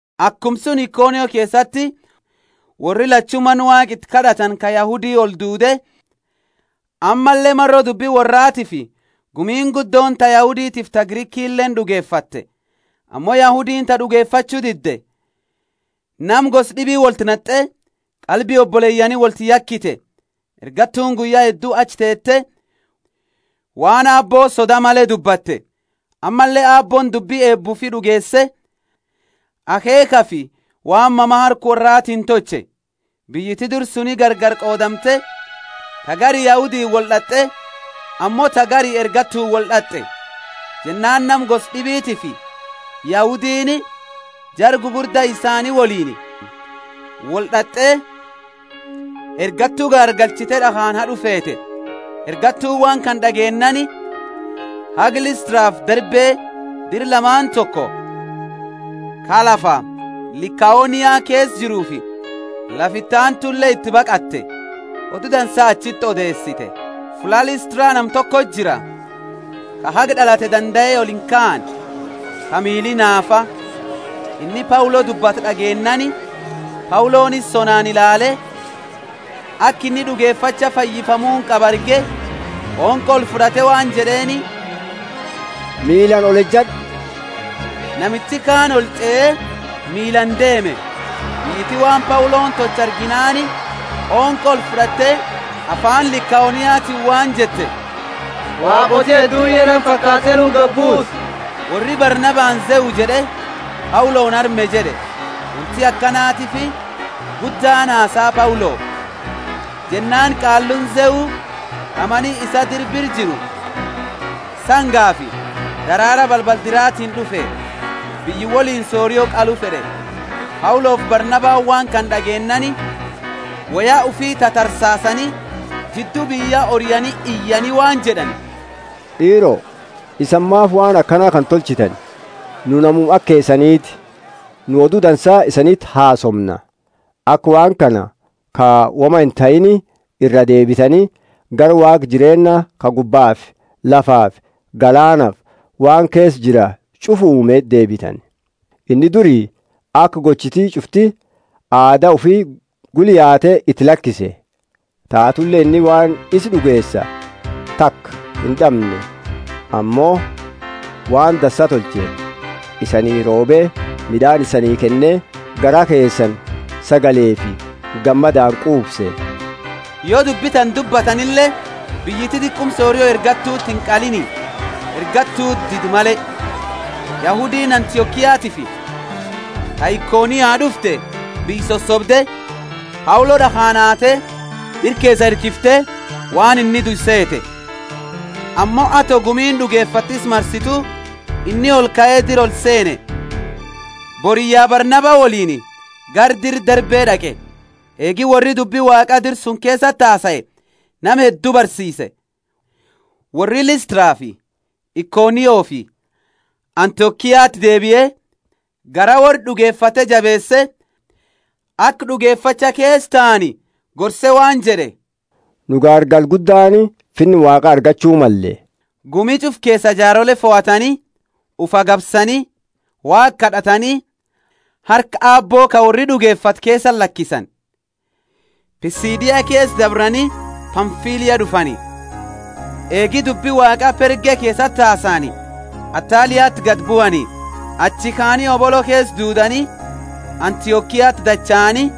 Akuma suni Ikonio keesati worri lachu mana Waaqa iti kad'atani ka Yahudi olduude, ammalle maro dubbi worraatiifi gumiini guddooni ta Yahuditiifi ta Grikileeni d'ugefatte. Ammo Yahudiini ta d'ugefachu didde, nama gosa d'ibi wolti nat'e, qalbi oboleyaani wolti yakite. Ergattuuni guyya heddu achi teete, waan Aabbo soda male dubbatte; ammalle Aabbooni dubbi eeba ufii d'ugeese, akheekhafi waan mama harka worraatiini tolche. Biyyiti dira suni gargari qoodamte, ta gari Yahudiini wold'at'e, ammo ta gari ergattuuni wold'at'e. Jennaani nama gosa d'ibitiifi Yahudiini, jara gugurda isaani woliini, wold'at'e, ergattu gaargalchite d'akhaani had'u feete. Ergattuuni waan kana d'ageennaani, haga Listrafi Derbe, dira lamaani toko, ka lafa Likaonia keesa jiruufi lafa iti aantule iti baqatte. Odu Dansa achiti odeesite. Fulla Listra nama tokoti jira, ka haga d'alate dandae olinkaane, ka miili naafa. Inni Paulo dubbatu d'ageennaani, Pauloni isa sonaani ilaale, aka inni d'ugefacha fayyifamuuni qabu arge, qonqo olfud'ate waan jed'eeni, Miilaani olejad'u! Namichi kaani olch'ee miilaani deeme. Biyyiti waan Pauloni tolche arginaani qonqo olfud'atte, afaani Likaoniatiini waan jette, Waaqooti hedduuni ya nama fakaate nuti gadi buute! Worri Barnabani Zeu jed'e, Pauloni Herme jed'e. Wonti akanatiifi guddaani hasaa Paulo. Jennaani qaalluuni Zeu, ka mani isaa dira bira jiru, sangafi daraara balbala diratiini d'ufe, biyya woliini sorio qalu fed'e. Paulofi Barnabani waan kana d'ageennaani, woya ufii tatarsaasani, jiddu biyya oriani iyani waan jed'ani, D'iiro, isani maafi waan akana kana tolchitani? Nu namuma aka keesaniti! Nu Odu Dansa isaniti hasoomna, aka waan kana ka woma intahiini iraa deebitani, gara Waaqa jireenna ka gubbafi lafafi galaanafi waan keesa jira ch'ufa uume deebitani. Inni duri aka gochiti ch'ufti aada ufi gula yaate iti lakise. Taatule inni waan isa d'ugeesa taka ind'amne ammo waan dansa tolche, isanii roobe, mid'aani isanii kenne garaa keesani sagalefi gammadaani quufsa. Yo dubbi tana dubbatanile biyyiti diquma sorio ergattuti inqaliini, ergattuti dide male. Yahudiini Antiokiatiifi ta Ikonio d'ufte biyya sosobde, Paulo d'akhaani haate, dira keesaa hirkifte, waan inni due seete. Ammo ato gumiini d'ugefatte isa marsitu, inni olkae dira olseene, boriyya Barnaba woliini gara dira Derbe d'aqe. Eegi worri dubbi Waaqa dira suni keesati hasae nama heddu barsiise, worri Listrafi Ikoniofi Antiokiati deebie, garaa worra d'ugefate jabeese aka d'ugefacha keesa taani gorse waan jed'e, Nu gaargala guddaani Finna Waaqa argachu malle. Gumi ch'ufa keesa jaarole fohatani, ufi agabsani, Waaqa kad'atani, harka Aabbo ka worri d'ugefate keesati lakisani. Pisidia keesa dabrani Pamfilia d'ufani. Eegi dubbi Waaqa Perge keesati hasaani, Attaliati gadi buani. Achi kaani hobolo keesa duudani, Antiokiati dachaani,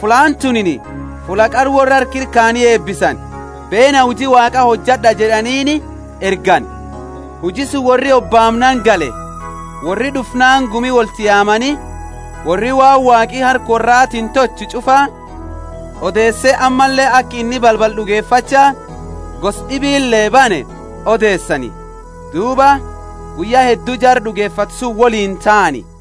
fullaani tunini fulla qara worra harka ira kayani eebbisani, Beena huji Waaqa hojad'a jed'aniini ergani. Huji suni worri hobaamnaani gale. Worri d'ufnaani gumi wolti yaamani, worri waan Waaqi harka worraatiini tolche ch'ufa odeese ammalle aka inni balbala d'ugefacha gosa d'ibile bane odeesani. Duuba guyya heddu jara d'ugefate suni woliini taani.